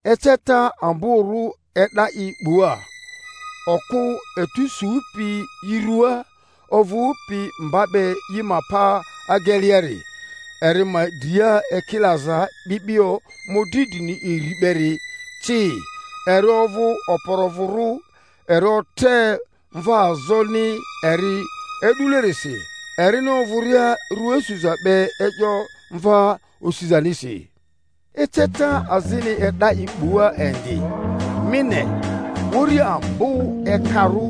Eceta amborᴜ e'da i 'bua: okᴜ etu supi i ruaa, ovᴜpi mba be i ma pa ageleari, eri ma dria ekilaza 'bi'bio mᴜdri drini iri beri ci; eri ovᴜ okporovᴜrᴜ, eri otre mvaazoni eri e'dulerisi, erini ovᴜria rua suza be e'yo mva osizanisi. Eceta azini e'da i 'bua indi: mi ne, uri ambo ekarᴜ,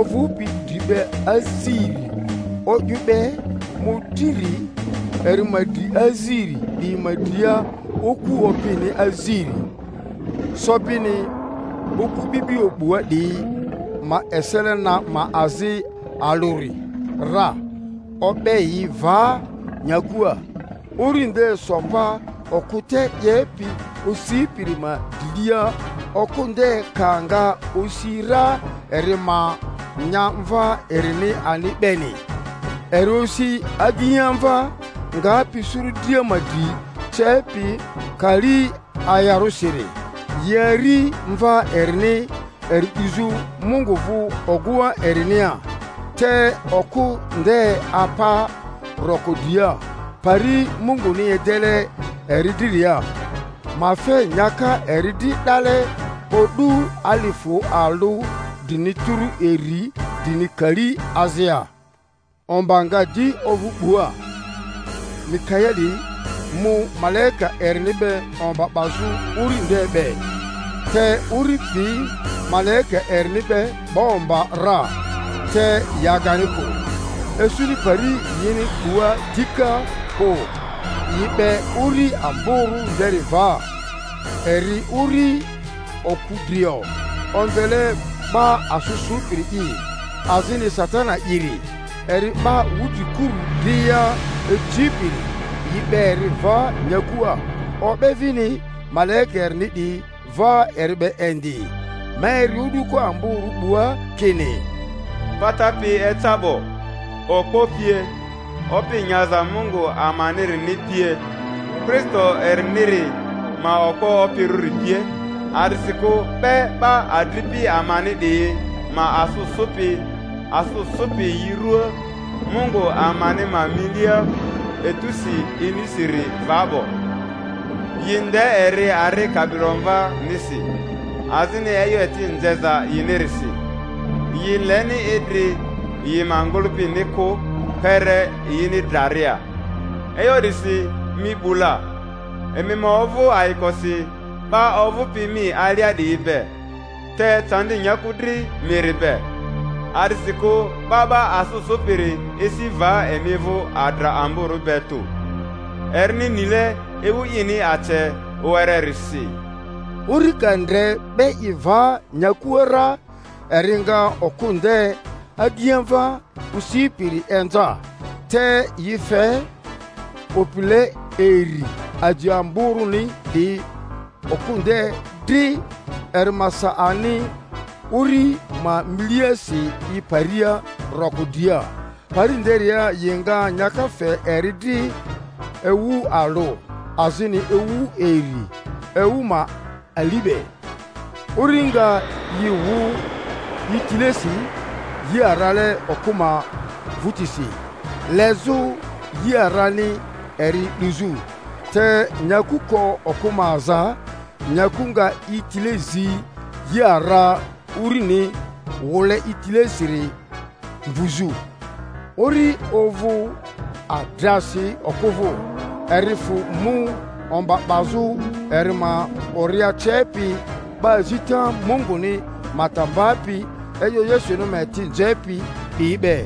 ovᴜpi dri be aziri o'yᴜ be mᴜdriri, eri ma dri aziri 'diyi ma dria oku opini aziri. Sobini okᴜ 'bi'bio 'bua 'diyi ma esele na ma azi alᴜri ra, o'be yi va nyakua. Uri nde so pa okᴜ te 'yepi osipiri ma drilia, okᴜ nde ka nga osi ra eri ma nya mva erini ani beni. Eri osi agiamva, ngapi suru dria ma dri cepi kali ayarᴜsiri; yi ari mva erini eri 'duzᴜ Mungu vᴜ ogᴜŋa erinia, te okᴜ nde apa roko dria, pari Munguni edele eri driria, ma fe nyaka eri dri 'dale o'du alifᴜ alᴜ drini tᴜrᴜ iri drini kali azia. Omba nga di ovᴜ 'bua: Mikaeli mu malaika erini be omba 'bazᴜ uri nde be; te uri pi malaika erini be 'ba omba ra, te yi agani kᴜ, isuni pari yini 'bua dika kᴜ. Yi 'be uri amborᴜ nderi va, eri uri oku drio, omvele 'Ba asᴜ Sᴜpiri'i, azini Satani'iri, eri 'ba wudrikuru dria icipiri—yi 'be eri va nyakua, o'be vini malaika erini 'diyi va eri be indi. Ma eri o'duko amborᴜ 'bua kini, Pata pi eca 'bo, okpo pie, opi nyaza Mungu amanirini pie, Kristo eriniri ma okpo opirᴜri pie, a'disikᴜ 'be 'ba adripi amani 'diyi ma asᴜ sᴜpi, asᴜ sᴜpi yi ruaa Mungu amani ma milia etusi inisiri va 'bo. Yi nde eri ari Kabilomvanisi, azini e'yo eti nzeza yinirisi; yi leni idri yi ma ngᴜlᴜpini kᴜ kpere yini draria. E'yo 'disi mi 'bu la, emi ma ovᴜ ayikosi 'ba ovᴜpi mi alia 'diyi be! Te candi nyaku dri miri be, a'disikᴜ 'ba 'ba asᴜ sᴜpiri esi va emi vᴜ adra amborᴜ be tᴜ, erini nile ewu ini ace wererisi! Uri ka ndre 'be i va nyakua ra, eri nga okᴜ nde agiamva osipiri inza. Te yi fe opile iri aji amborᴜni 'diyi okᴜ nde dri, eri ma sa ani uri ma miliasi i paria roko dria, pari nderia yi nga nyaka fe eri dri ewu alᴜ, azini ewu iri, ewu ma ali be. Uri nga yi wu i tilesi yi arale okᴜ ma vᴜtisi, lezᴜ yi arani eri 'duzᴜ. Te nyaku ko okᴜ ma aza, nyaku nga i tile zi yi ara urini wule i tilesiri mvuzᴜ. Uri ovᴜ adrasi okᴜ vᴜ, eri fᴜ mu omba 'bazᴜ eri ma ori acepi, 'ba azita Munguni ma ta mbapi e'yo Yesuni ma eti nzepi 'diyi be.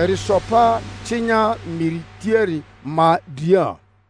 Eri so pa cinya miri tiari ma dria.